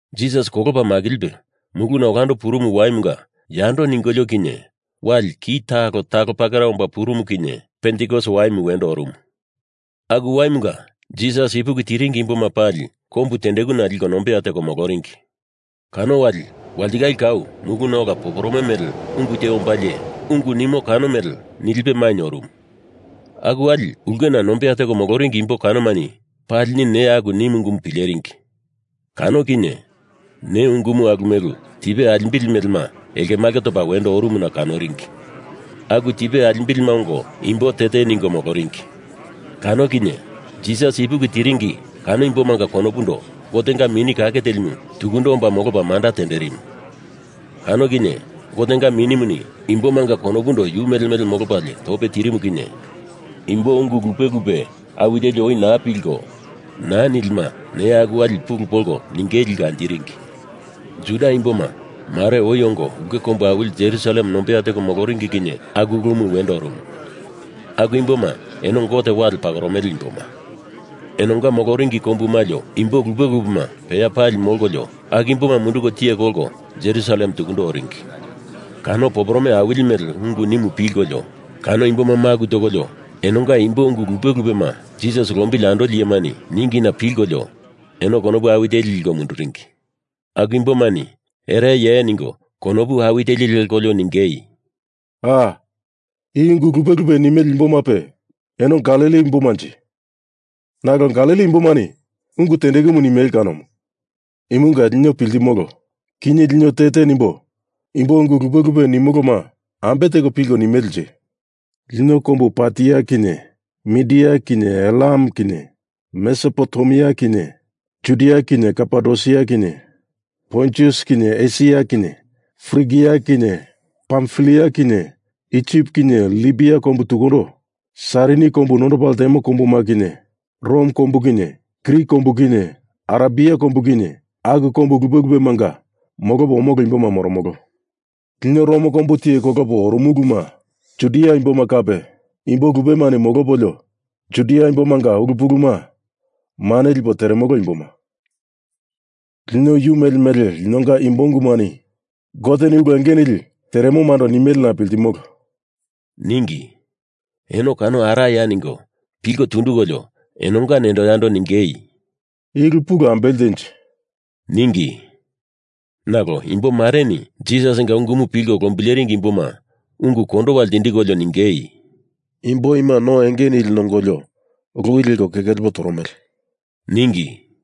Jisas kolopa makilipe muluna olando purumu waimunga yando ningolio kinye wali ki talo talo pakera omba purumu kinye Pentikos waimu wendo orumu. Aku waimunga Jisas ipuki tiringi imboma pali kombu tendekuna liko nombeya teko moloringi. Kano wali walitikale kau muluna ola poporome mele ungu te ombalie ungu nimo kano mele nilipe mainye orumu. Aku wali ulkena nombeya teko moloringi imbo kanomani palini neya aku nimu ungumu pileringi. Kano kinye ne ungumu alumelu tipe alimbili melema elkemalke topa wendo orumuna kanoringi. Aku tipe alimbilima ongo imbo te te ningo moloringi. Kano kinye Jisas ipuki tiringi kano imbomanga konopundo Gotenga Mini Kake Telimu tukundo omba molopa manda tenderimu. Kano kinye Gotenga Minimuni imbomanga konopundo yu mele mele molopalie tope tirimu kinye imbo ungu lupe lupe awi teli oi naa pilko naa nilima neya aku wali pulu polko ningei liko anjiringi. Juda imboma, mare oi ongo ulke kombu awili Jerusalem nombeya teko moloringi kinye aku ulumu wendo orumu. Aku imboma eno Gote wale pakoromele imboma. Enonga moloringi kombu malio imbo lupe lupema peya pali molkolio aku imboma munduko tiye kolko Jerusalem tukundo oringi. Kano poporome awili mele ungumu pilkolio kano imboma maku tokolio enonga imbo ungu lupe lupema Jisas lombili andoli iyemani ningina pilkolio eno konopu awi teli liko munduringi. Aku imbomani ereye ningo konopu awi teli lekolio ningei, “Aa, i ungu lupe lupe nimele imbomape eno Galili imbomanje? Nalo Galili imbomani ungu tendekumu nimele kanomu. Imunga lino piltimolo, kinye lino te te nimbo imbo ungu lupe lupe nimoloma ambe teko pilkolio nimelenje. Lino kombu Partia kinye Mindiya kinye Elam kinye Mesopotemia kinye Judia kinye Kapadosia kinye Pontus kinye Esia kinye Frigia kinye Pamfilia kinye Isip kinye Libia tukundo Sairini kombu nondopa ltemo kombuma kinye Rom kombu kinye Krit kombu kinye Arebia kombu kinye aku kombu lupe lupemanga molopo omolo imboma moromolo. Lino Rom kombu tiye kolopa oromuluma Judia imboma kape imbo lupemani molopolio Judia imbomanga ulu puluma mane lipo teremolo imboma. Lino yu mele mele linonga imbo ungumani Goteni ulu enge nili teremomando nimelena piltimolo,” ningi. Eno kano araya ningo pilko tundukolio enonga nendo yando ningei, “I ulu pulu ambele tenje,” ningi. Nalo imbo mareni Jisasinga ungumu pilko lombileringi imboma ungu kondowa ltindikolio ningei, “Imbo ima no enge nili nongolio loi leko keke lepo toromele,” ningi.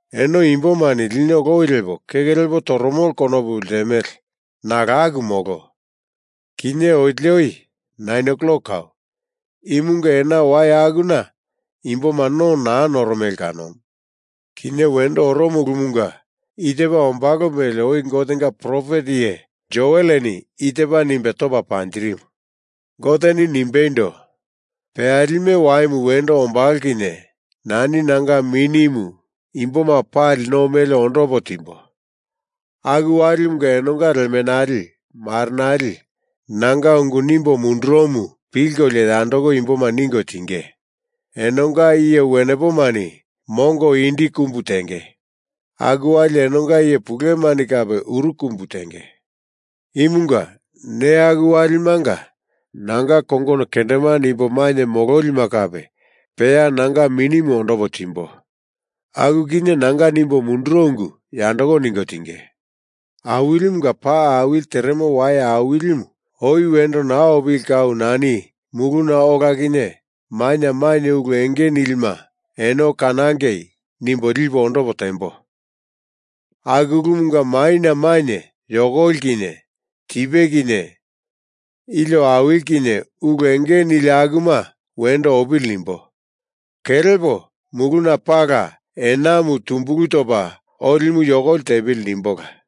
Eno imbomani lino lowi lepo keke lepo toromolo konopu ltemele nalo aku molo. Kinye otili oi nain klok kau, imunga ena wai akuna imboma no naa noromele kanomu. Kinye wendo oromo ulumunga i tepa ombalo mele oi Gotenga profet iye Joeleni i tepa nimbe topa panjirimu: Goteni nimbeindo: Peyalime waimu wendo ombalo kinye nani nanga Minimu imboma pali no mele ondopo timbo. Aku walimunga enonga lemenali marenali nanga ungu nimbo munduromu pilkolio yandoko imboma ningo tinge. Enonga iye wenepomani mongo indi kumbu tenge. Aku wali enonga iye pulumani kape uru kumbu tenge. Imunga neya aku walimanga nanga kongono kendemande imbo mainye mololima kape peya nanga minimu ondopo timbo. Aku kinye nanga nimbo munduro ungu yandoko ningo tinge. Awilimunga pa awili teremo wai awilimu oi wendo naa opili kau nani muluna ola kinye maina mainye ulu enge nilima eno kanangei nimbo lipo ondopo tembo. Aku ulumanga maina mainye yokoli kinye tipe kinye ilio awili kinye ulu enge nili akuma wendo opili nimbo. Kelepo muluna pala enamu tumbulu topa olimu yokoli tepili nimbola.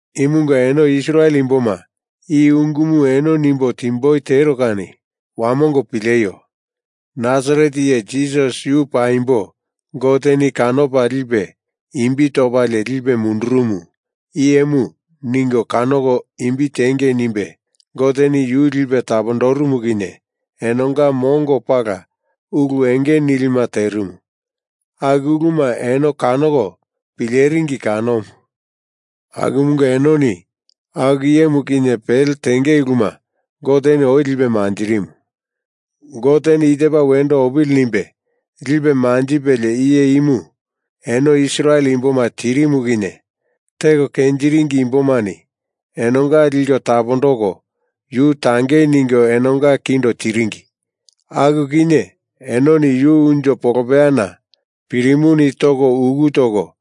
Imunga eno Israel imboma i ungumu eno nimbo timboi tero kani wamongo pileio! Nasaret iye Jisas yu paimbo Goteni kanopa lipe imbi topalie lipe mundurumu iyemu ningo kanoko imbi tengei nimbe Goteni yu lipe tapondorumu kinye enonga mongo pala ulu enge nilima terimu. Aku uluma eno kanoko pileringi kanomu. Akumunga enoni aku iyemu kinye pele tenge uluma Goteni oi lipe manjirimu. Goteni i tepa wendo opili nimbe lipe manjipelie iye imu eno Israel imboma tirimu kinye teko kenjiringi imbomani enonga liko tapondoko yu tangei ningo enonga kindo tiringi. Aku kinye enoni yu unjo polopeyana pirimuni toko uku toko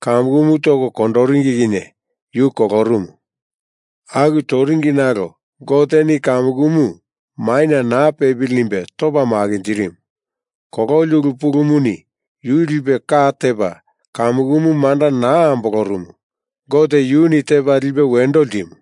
kamukumu toko kondoringi kinye yu kolorumu. Aku toringi nalo Goteni kamukumu maina naa pepili nimbe topa makinjirimu. Kololi ulu pulumuni yu lipe ka tepa kamukumu manda naa ambolorumu. Gote yuni tepa lipe wendo ltimu.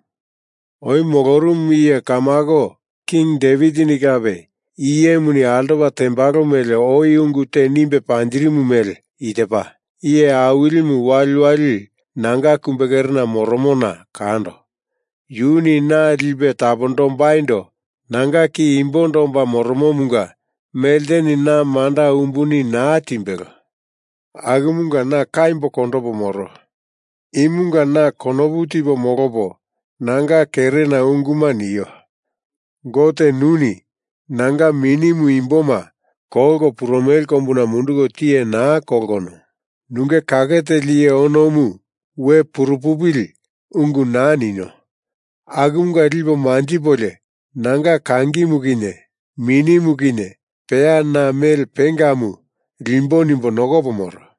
Oi molorumu iye kamako King Devitini kape iye imuni altopa tembalo mele oi ungu te nimbe panjirimu mele i tepa, Iye Awilimu waliwali nanga kumbekerena moromona kando. Yuni na lipe tapondombaindo nanga ki imbondo omba moromomunga melteni na manda umbuni naa timbelo. Akumunga na kaimbo kondopo moro. Imunga na konopu tipo molopo nanga kerena unguma nio. Gote nuni nanga minimu imboma kolko purumele kombuna munduko tiye naa kolkono, nunge kake teli iye onomu we puru pupili ungu naa nino. Akumunga lipo manjipolio nanga kangimu kinye minimu kinye peya na mele pengamu limbo nimbo nokopo moro.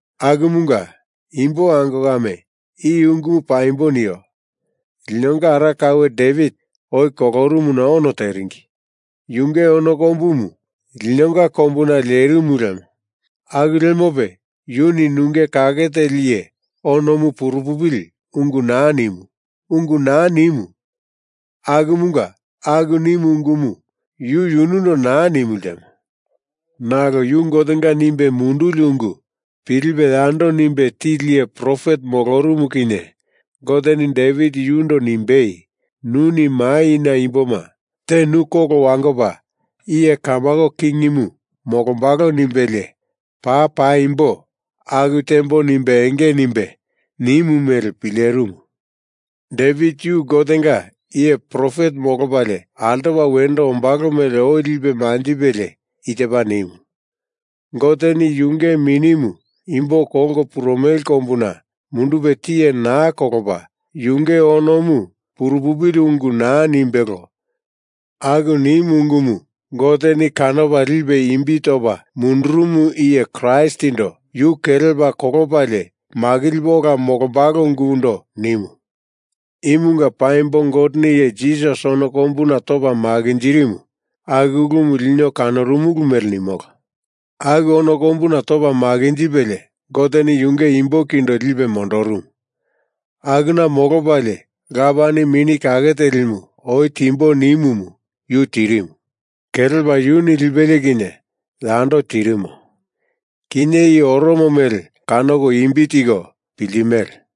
Akumunga, imbo ango kame i ungumu paimbo nio. Linonga ara kaue Devit oi kolorumuna ono teringi. Yunge ono kombumu linonga kombuna lerimu lemo. Aku lemope yuni nunge kake teli iye onomu purupupili ungu naa ninu ungu naa nimu. Akumunga aku nimu ungumu yu yunundo naa nimu ltemo. Nalo yu Gotenga nimbe munduli ungu pilipe yando nimbe tili iye profet molorumu kinye Goteni Devit yundo nimbei nuni maina imbo te nu kolo wangopa iye kamako kingimu molombalo nimbelie paa paimbo aku tembo nimbe enge nimbe nimu mele pilerimu. Devit yu Gotenga iye profet molopalie altopa wendo ombalo mele oi lipe manjipelie i tepa nimu, Goteni yunge minimu imbo kolko purumele kombuna mundupe tiye naa kolopa yunge onomu purupupili ungu naa nimbelo. Aku nimu ungumu Goteni kanopa lipe imbi topa mundurumu iye Kraistindo yu kelepa kolopalie makilipe ola molombalo ungundo nimu. Imunga paimbo Goteni iye Jisas ono kombuna topa makinjirimu, aku ulumu lino kanorumulu mele nimolo. Aku ono kombuna topa makinjipelie Gote yunge imbo kindo lipe mondorumu. Akuna molopalie Lapani Mini Kake Telimu oi timbo nimumu yu tirimu. Kelepa yuni lipelie kinye yando tirimo. Kinye i oromo mele kanoko imbi tiko piltimele.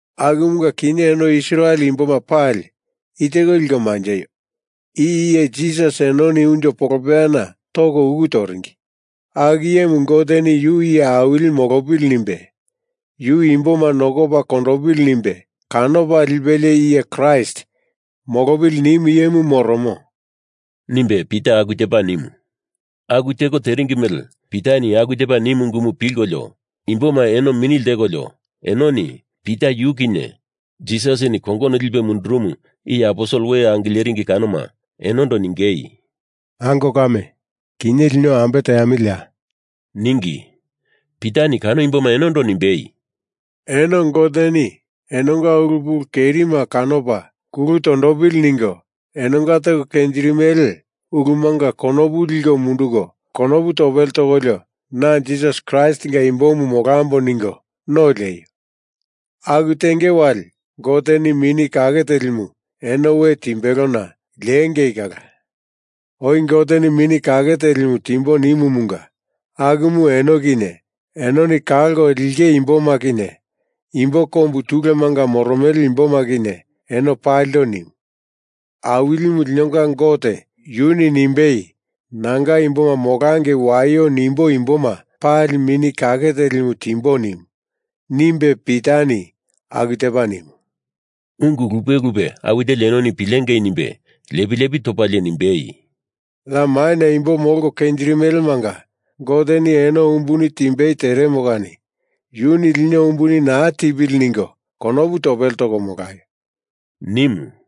Akumunga kinye eno Israel imbo pali i teko liko manjeio: I iye Jisas enoni unjo polopeyana toko uku toringi. Aku iyemu Goteni yu iye awili molopili nimbe, yu imboma nokopa kondopili nimbe kanopa lipelie iye Kraist molopili nimu iyemu moromo,” nimbe Pita aku tepa nimu. Aku teko teringi mele Pitani aku tepa nimu ungumu pilkolio imboma eno mini ltekolio enoni Pita yu kinye Jisasini kongono lipe mundurumu iye aposel we angileringi kanoma enondo ningei, “Ango kame, kinye lino ambe teamiliya?” ningi. Pitani kano imboma enondo nimbei, “Eno Goteni enonga ulu pulu kerima kanopa kulu tondopili ningo enonga teko kenjirimele ulumanga konopu liko munduko konopu topele tokolio na Jisas Kraistinga imbomu molambo ningo no lieio. Aku tenge wali Goteni Mini Kake Telimu eno we timbelona liengei kala. Oi Goteni Mini Kake Teli timbo nimumunga akumu eno kinye enoni kalko linge imboma kinye imbo kombu tulemanga moromele imboma kinye eno palindo nimu. Awilimu linonga Gote yuni nimbei nanga imboma molangei waio nimbo imboma pali Mini Kake Telimu timbo nimu nimbe Pitani aku tepa nimu. Ungu lupe lupe awi teli enoni pilengei nimbe lepi lepi topalie nimbei, “Ya maina imbo molko kenjirimele manga Goteni eno umbuni timbei teremo kani yuni lino umbuni naa tipili ningo konopu topele toko molaio,” nimu.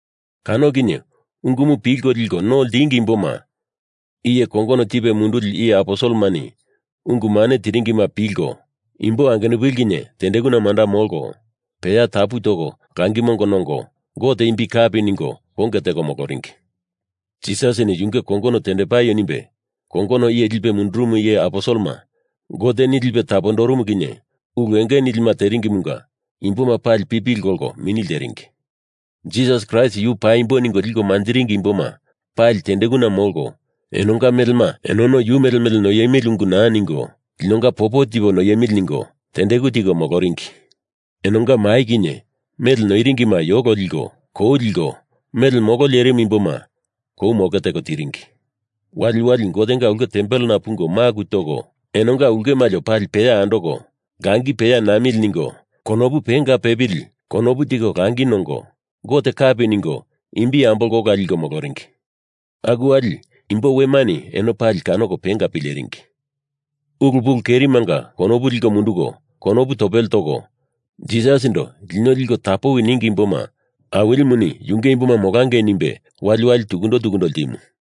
Kano kinye ungumu pilko liko no ltingi imboma iye kongono tipe munduli iye aposelemani ungu mane tiringima pilko imbo angenupili kinye tendekuna manda molko, peya tapu toko langi mongo nongo, Gote imbi kapi ningo konge teko moloringi. Jisasini yunge kongono tendepaio nimbe kongono iye lipe mundurumu iye aposelema Goteni lipe tapondorumu kinye ulu enge nilima teringimunga imboma pali pipili kolko mini lteringi. Jisas Kraist yu paimbo ningo liko manjiringi imboma pali tendekuna molko enonga melema enono yu mele mele noiemili ungu naa ningo linonga popo tipo noiemili ningo tendeku tiko moloringi. Enonga mai kinye mele noiringima yolo liko kou liko mele molo lerimu imboma kou moke teko tiringi. Waliwali Gotenga ulke tempelena pungo maku toko enonga ulke malio pali peya andoko langi peya namili ningo konopu penga pepili konopu tiko langi nongo Gote kapi ningo imbi ambolko ola liko moloringi. Aku wali imbo wemani eno pali kanoko penga pileringi. Ulu pulu kerimanga konopu liko munduko konopu topele toko Jisasindo lino liko tapowi ningi imboma Awilimuni yunge imboma molangei nimbe waliwali tukundo tukundo ltimu.